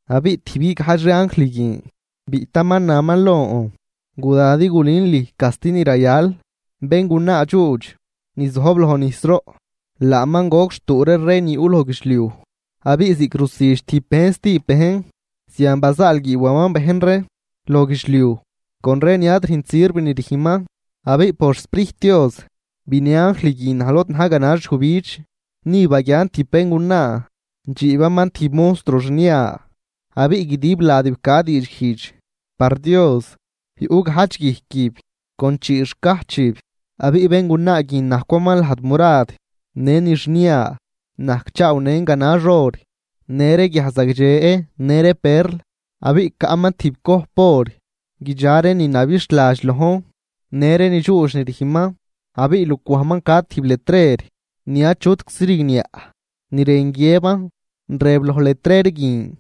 Abiꞌ tijb guigajdx ree anjl guin biꞌtaman naman lon: ―Guda din gulün lüj casti ni rayal béngunaa dxuudx ni zojb loj nijsroꞌ, laaman goc xtuu ree rey ni yuꞌ loj guidxliuj, abiꞌ ziꞌc rusüdx tijb bejn stijb bejn, zian bazaalguiiwaman bejn ree loj guidxliuj con ree ni ad rüjnt sirv ni rüjnman. Abiꞌ por xSprijt Dios binë anjl guin naj lod na̱j ganax yujbidx. Ni baguian tijb béngunaa dxiibaman tijb monstruo xnia, abiꞌ guidib ladib ca diidxguijdx par Dios, yuꞌ gajdx guijquib con chii xcajchib. Abiꞌ béngunaa guin najcwaman lajd murad në ni xnia, najcchaawnën ganax or në ree guiaj zagdxe në ree perl. Abiꞌ caꞌman tijb cojp or guidxa ree ni nabixhladx lojn në ree ni dxuudx ni rüjnman. Abiꞌ lucwajman ca tijb letrer ni achutczi rigniaꞌ ni rën guiëban, rëb loj letrer guin: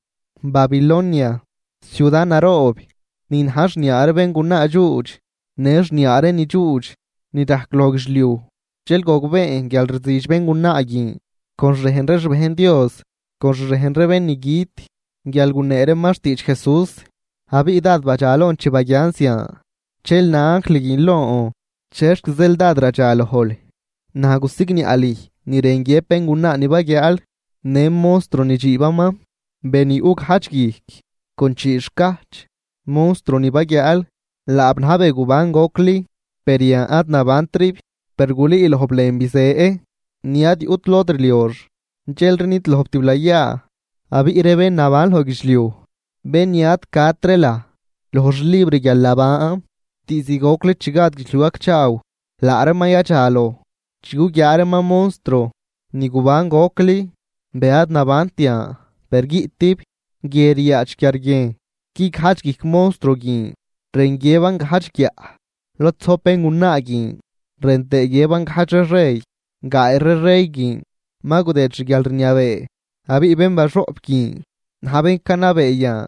“Babilonia, ciuda naroob ni na̱j xniaa ree béngunaa dxuudx në xniaa ree ni dxuudx ni rajc loj guidxliuj,” Dxel gogbeen guial rzüdx béngunaa guin con xrejn ree xbejn Dios, con xrejn ree bén ni güt guial gunee reeman xtiidx Jesús. Abiꞌ dád badxalon chi baguian zian. Dxel na anjl guin lon: ―¿Chexc zeel dád radxalojl? Naj gusigniaꞌ lüj ni rën guiëb béngunaa ni baguiaal në monstruo ni dxiibaman, be ni yuꞌ gajdx guijc con chii xcajch. Monstruo ni baguiaal, laab na̱j be guban gocli, per yan ad nabantrib. Per gulüülojb lën bizë ni ad yuꞌt lod rliox dxelri nidlojb tiblayaa. Abiꞌ ree bén naban loj guidxliuj, bén ni ad cat ree laj loj xlibr guialnaban diizd gocli chi gad guidxliuj gacchaaw, laa reeman yadxaloj chi guguiaa reeman monstruo ni guban gocli, be ad nabant yan per guiꞌtib. ’Guie ryaadx quiarguiejn. Guigajdx guijc monstruo guin rën guiëban gajdx guiaꞌ lod zojb béngunaa guin rën tëë guiëban gajdx ree rey. Gaay ree rey guin ma gudëëd xguialrniabee, abiꞌ bén baxoꞌp guin na̱j bén canabee yan.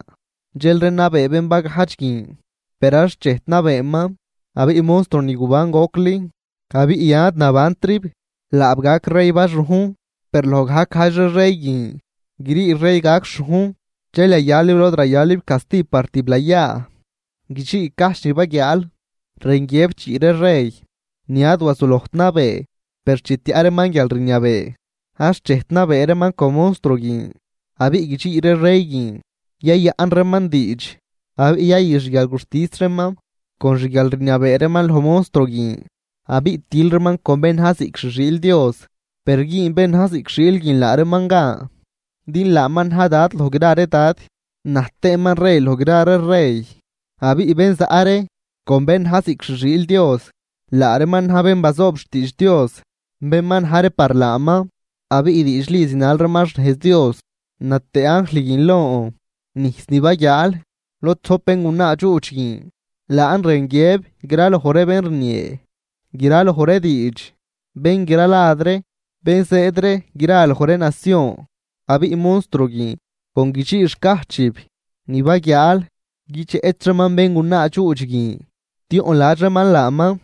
Dxelri nabee bén bagajdx guin, per ad xchejt nabeeman. Abiꞌ monstruo ni guban gocli, abiꞌ yan ad nabantrib, laab gac rey baxujn, per loj gajc gajdx ree rey guin grii rey gac xhujn dxel yayalib lod rayalib casti par tiblayaa. ’Guidxii cajch ni baguiaal rën guiëb chii ree rey ni ad wazulojt nabee. Per chi tiaꞌ reeman guialrniabee, ad xchejt nabee reeman con monstruo guin. Abiꞌ guidxii ree rey guin yayaꞌn reeman diidx abiꞌ yayü xguialguxtis reeman con xguialrniabee reeman loj monstruo guin, abiꞌ til reeman con bén na̱j ziꞌc xi xiil Dios. Per güün bén na̱j ziꞌc xiil guin laa reeman gan din laaman na̱j Dad loj gra ree dad, na̱j tëëman rey loj gra ree rey. Abiꞌ bén zaꞌ ree con bén na̱j ziꞌc xi xiil Dios, laa reeman na̱j bén bazoob xtiidx Dios, bén ma na̱j ree par laaman abiꞌ diidxli zinal reeman xnejz Dios. Na tëë anjl guin lon: ―Nijs ni baguiaal lod zojb béngunaa dxuudx guin laan rën guiëb graloj ree bén rniee graloj ree diidx, bén gra lad ree, bén zëëd ree gra loj ree nacion. Abiꞌ monstruo guin con guidxii xcajchib ni baguiaal, guidxeꞌch reeman béngunaa dxuudx guin, tioꞌnladx reeman laaman,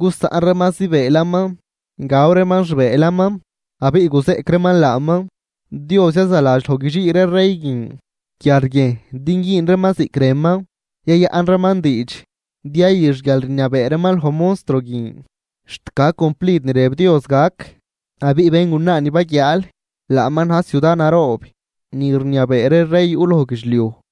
gusaꞌn reeman zibëëlaman, gaw reeman xbëëlaman abiꞌ guzeꞌc reeman laaman. Dios yazaladx loj guidxii ree rey guin quiarguiejn din güün reeman ziꞌc rënman. Yayaꞌn reeman diidx din yayü xguialrniabee reeman loj monstruo guin, xt gac cumplid ni rëb Dios gac. Abiꞌ béngunaa ni baguiaal, laaman na̱j ciuda naroob ni rniabee ree rey yuꞌ loj guidxliuj.